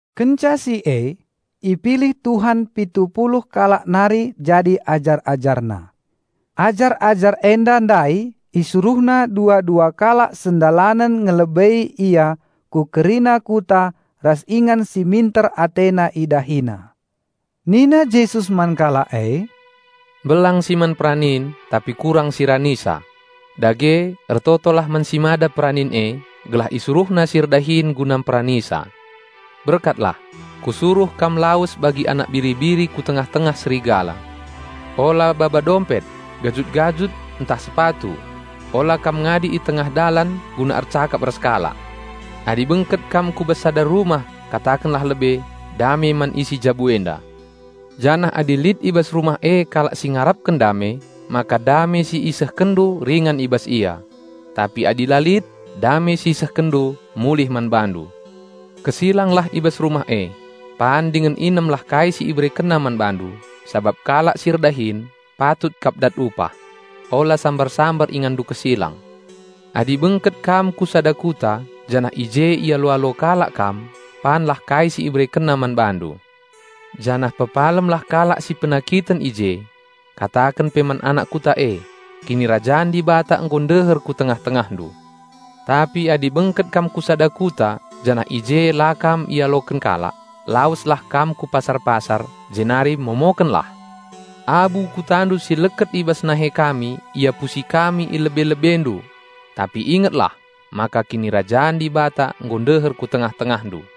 Kenca si e, ipilih Tuhan pitu puluh kalak nari jadi ajar-AjarNa. Ajar-ajar enda ndai IsuruhNa dua-dua kalak sendalanen ngelebei Ia ku kerina kuta ras ingan si minter AteNa IdahiNa. Nina Jesus man kalak e, "Mbelang si man peranin, tapi kurang si ranisa. Dage, ertotolah man si Mada peranin e, gelah IsuruhNa si erdahin guna mperanisa. Berkatlah! Kusuruh kam lawes bagi anak biri-biri ku tengah-tengah serigala. Ola baba dompet, gajut-gajut, ntah sepatu, ola kam ngadi i tengah dalan guna ercakap ras kalak. Adi bengket kam ku bas sada rumah katakenlah lebe, 'Dame man isi jabu enda.' Janah adi lit i bas rumah e kalak si ngarapken dame, maka dame si isehkenndu ringan i bas ia. Tapi adi la lit, dame si isehkenndu mulih man bandu. Kesilanglah i bas rumah e, pan dingen inemlah kai si iberekenna man bandu, sabap kalak si erdahin patut kap dat upah. Ola sambar-sambar inganndu kesilang. Adi bengket kam ku sada kuta janah i je ialo-alo kalak kam, panlah kai si iberekenna man bandu; janah pepalemlah kalak si penakiten i je. Kataken pe man anak kuta e, 'Kinirajan Dibata nggo ndeher ku tengah-tengahndu!' Tapi adi bengket kam ku sada kuta janah i je la kam ialoken kalak, laweslah kam ku pasar-pasar, jenari momokenlah, 'Abu kutandu si leket i bas nahe kami iapusi kami i lebe-lebendu; tapi ingetlah, maka Kinirajan Dibata nggo ndeher ku tengah-tengahndu.'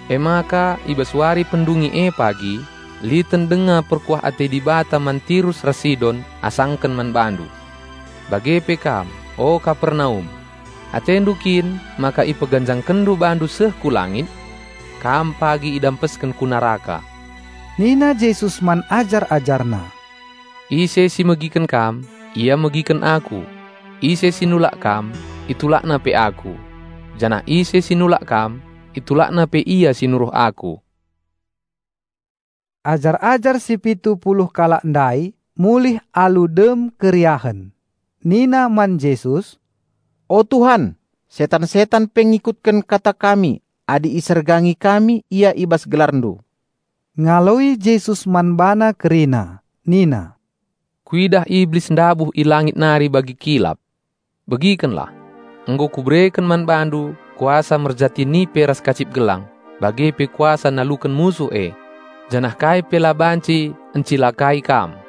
Emaka i bas wari pendungi e pagi, liten denga perkuah ate Dibata man Tirus ras Sidon asaken man bandu. Bage pe kam, o Kapernaum! Atendu kin maka ipeganjangkenndu bandu seh ku langit? Kam pagi idampesken ku neraka." Nina Jesus man ajar-AjarNa, "Ise si megiken kam, ia megiken Aku; ise si nulak kam, itulakna pe Aku; janah ise si nulak kam, itulakna pe Ia si nuruh Aku." Ajar-ajar si pitu puluh kalak ndai mulih alu dem keriahen. Nina man Jesus, "O Tuhan, setan-setan pe ngikutken kata kami adi isergangi kami ia i bas GelarNdu!" Ngaloi Jesus man bana kerina nina, "Kuidah Iblis ndabuh i langit nari bagi kilap. Begikenlah! Nggo kubereken man bandu kuasa merjati nipe ras kacip gelang, bage pe kuasa naluken musuh e, janah kai pe la banci encilakai kam.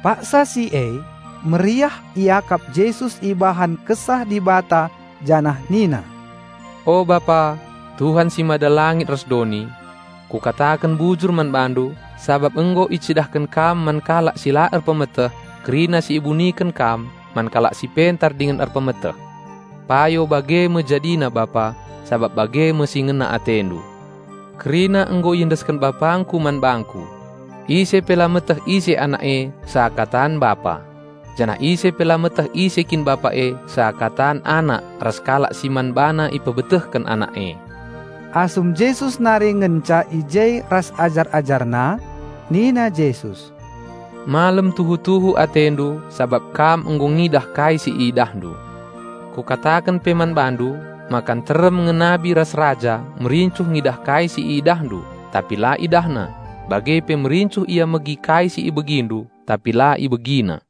Paksa si e, meriah iakap Jesus ibahan Kesah Dibata janah nina, "O Bapa, Tuhan si mada langit ras doni! Kukataken bujur man BaNdu, sabap nggo icidahken Kam man kalak si la erpemeteh, kerina si ibuniken Kam man kalak si pentar dingen erpemeteh. Payo bage me jadina Bapa, sabap bage me si ngena AteNdu. Kerina nggo iendesken BapangKu man bangKu. Ise pe la meteh ise Anak e seakatan Bapa; janah ise pe la meteh ise kin Bapa e seakatan Anak ras kalak si man bana ipebetehken Anak e." Asum Jesus nari ngenca i je ras ajar-AjarNa nina Jesus, "Malem tuhu-tuhu atendu sabap kam nggo ngidah kai si idahndu! Kukataken pe man bandu maka nterem nge nabi ras raja merincuh ngidah kai si idahndu tapi la idahna, bage pe merincuh ia megi kai si ibegindu, tapi la ibegina."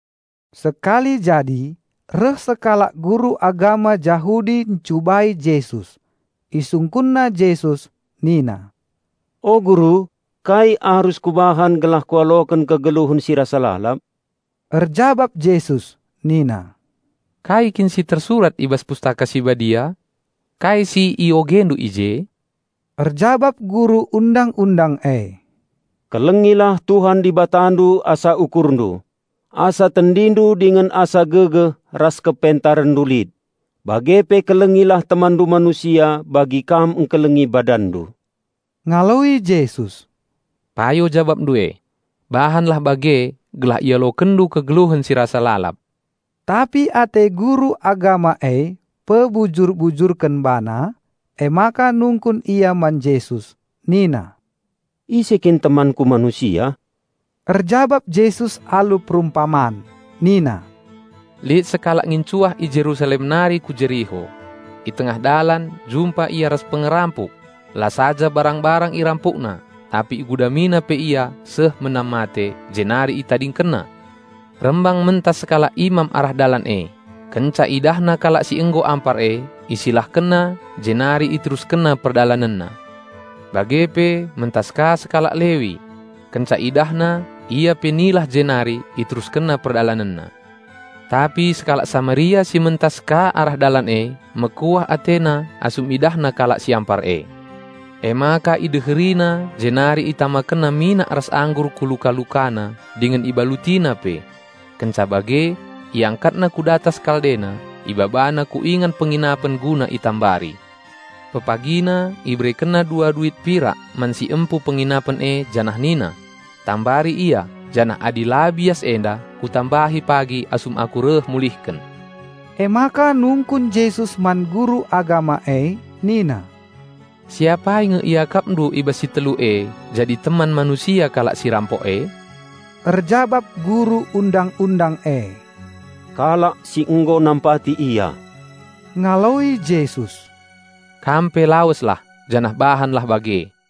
Sekali jadi reh sekalak guru agama Jahudi ncubai Jesus. Isungkunna Jesus nina, "O Guru, kai arus kubahan gelah kualoken kegeluhen si rasa lalap?" Erjabap Jesus nina, "Kai kin si tersurat i bas Pustaka Si Badia? Kai si iogendu i je?" Erjabap guru Undang-undang e, "Kelengilah Tuhan Dibatandu asa ukurndu, asa tendindu dingen asa gegeh ras kepentarenndu lit; bage pe kelengilah temanndu manusia bagi kam ngkelengi badanndu." Ngaloi Jesus, "Payo jabapndu e. Bahanlah bage gelah ialokenndu kegeluhen si rasa lalap." Tapi ate guru agama e pebujur-bujurken bana, emaka nungkun ia man Jesus nina, "Ise kin temanku manusia?" Erjabap Jesus alu perumpaman nina, "Lit sekalak ngincuah i Jerusalem nari ku Jeriho. I tengah dalan jumpa ia ras pengerampuk. La saja barang-barang irampukna, tapi igudamina pe ia seh menam mate, jenari itadingkenna. Rembang mentas sekalak imam arah dalan e; kenca idahna kalak si nggo ampar e, isilahkenna, jenari iteruskenna perdalanenna. Bage pe mentas ka sekalak Lewi; kenca idahna, ia pe nilah jenari iteruskenna perdalanenna. Tapi sekalak Samaria si mentas ka arah dalan e mekuah atena asum idahna kalak si ampar e. Emaka ideherina jenari itamakenna minak ras anggur ku luka-lukana dingen ibalutina pe. Kenca bage iangkatna ku datas kaldena, ibabana ku ingan penginapen guna itambari. Pepagina iberekenna dua duit pirak man si empu penginapen e janah nina, 'Tambari ia janah adi la bias enda kutambahi pagi asum aku reh mulihken.'" Emaka nungkun Jesus man guru agama e nina, "Si apai nge iakapndu i bas si telu e jadi teman manusia kalak si irampok e?" Erjabap guru Undang-undang e, "Kalak si nggo nampati ia." Ngaloi Jesus, "Kam pe laweslah, janah bahanlah bage."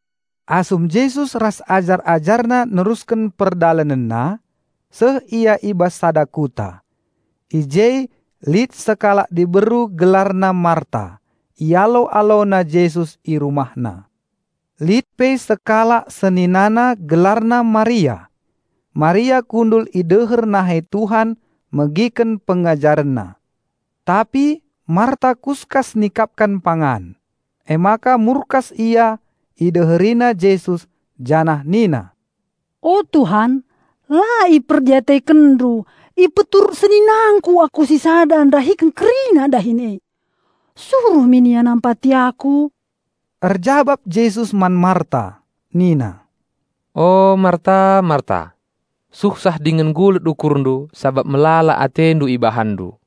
Asum Jesus ras ajar-AjarNa nerusken perdalanenna, seh ia i bas sada kuta. I je lit sekalak diberu gelarna Marta; ialo-alona Jesus i rumahna. Lit pe sekalak seninana gelarna Maria. Maria kundul i deher nahe Tuhan megiken PengajarenNa. Tapi Marta kuskas nikapken pangan; emaka murkas ia ideherina Jesus janah nina, "O Tuhan, la IperdiatekenNdu ipeturut seninangku aku sisada ndahiken kerina dahin e? Suruh min ia nampati aku!" Erjabap Jesus man Marta nina, "O Marta, Marta! Suhsah dingen gulut ukurndu sabap melala atendu ibahanndu,